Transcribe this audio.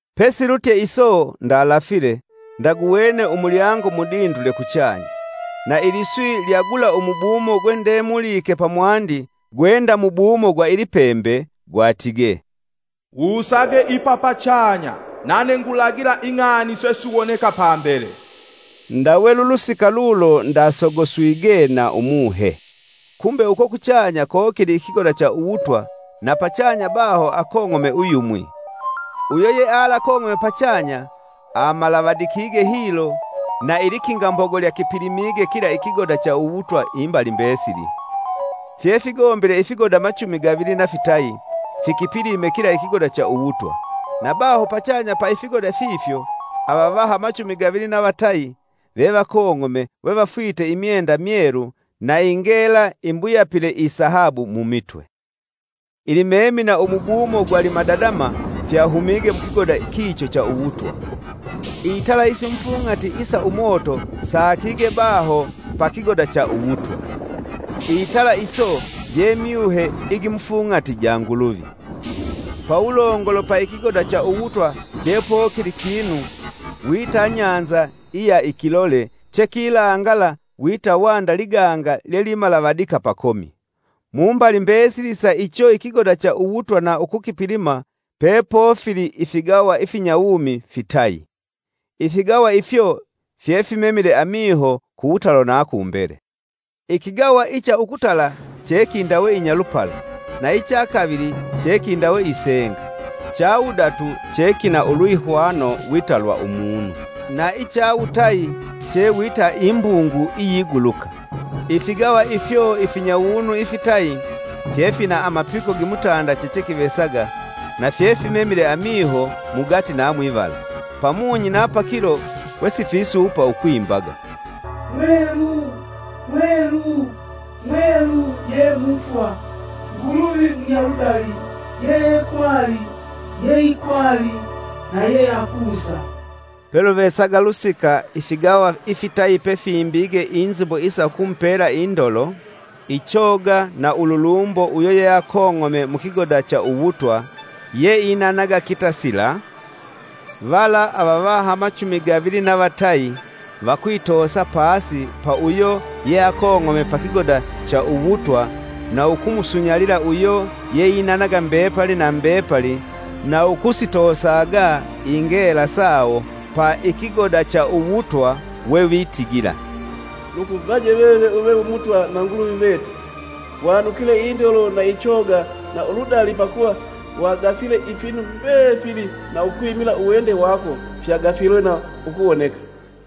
Pesilutye iso ndalafile, ndaguwene umulyango mudindule kuchanya. Na iliswi lya gula umubumo gwendemulike pamwandi gwe nda mubumo gwa ilipembe, gwatige, “Wusage ipa pachanya nane ngulagila ing'ani sesiwoneka pambele.” Ndawe lulusika lulo ndasogoswige na Umuhe. Kumbi uko kuchanya kokili ikigoda cha uwutwa na pachanya baho akong'ome uyumwi. Uyo yealakong'ome pachanya amalavadikige hilo na ilikingambogo lyakipilimige kila ikigoda cha uwutwa imbali mbesili. Fyefigombile ifigoda machumi gavili na fitayi fikipilime kila ikigoda cha uwutwa, na baho pachanya pa ifigoda fifyo, avavaha machumi gavili na vatayi vevakong'ome we vafwite imyenda myelu na ingela imbuyapile isahabu mumitwe. Ilimemi na umubumo gwa limadadama, fyahumige mukigoda kicho cha uwutwa. Itala isimufung'ati isa umoto saakige baho pakigoda cha uwutwa. Itala iso je myuhe igimufung'ati ja Nguluvi. Pawulongolo pa ikigoda cha uwutwa chepokili kinu wita nyanza iya ikilole, chekilangala wita wanda liganga lyelimalavadika pakomi. Mumbali mbesili sa icho ikigoda cha uwutwa na ukukipilima, pepofili ifigawa ifinyawumi fitayi. Ifigawa ifyo fyefimemile amiho kuwutalo na kumbele. Ikigawa icha ukutala chekindawe inyalupala, na icha kavili chekindawe isenga, cha wudatu chekina ulwihwano wita lwa umunu, na icha wutayi che wita imbungu iyiguluka. Ifigawa ifyo ifinyawunu ifitayi fyefina amapiko gimutanda chechekivesaga, na fyefimemile amiho, mugati na mwivala. Pamunyi na pakilo, wesifisuupa ukwimbaga: “Mwelu, Mwelu, Mwelu Ye Mutwa, Nguluvi Munyaludali, yeekwali, yeikwali na yeakusa!” Peluvesaga lusika ifigawa ifitayi pefimbige inzimbo isa ukumupela indolo, ichoga na ululumbo uyo yeakong'ome mukigoda cha uwutwa, yeainanaga kitasila, vala avavaha machumi gavili na vatayi, vakwitosa pasi pa uyo yeakong'ome pa kigoda cha uwutwa na ukumusunyalila uyo yeinanaga mbepali na mbepali na ukusitoosaga ingela sawo pa ikigoda cha uwutwa wevitigila: “Lukuvaje veve uve wi Mutwa na Nguluvi vetu, wanukile indolo na ichoga na uludali pakuva wagafile ifinu mbefili na ukwimila uwende wako fyagafilwe na ukuwoneka.”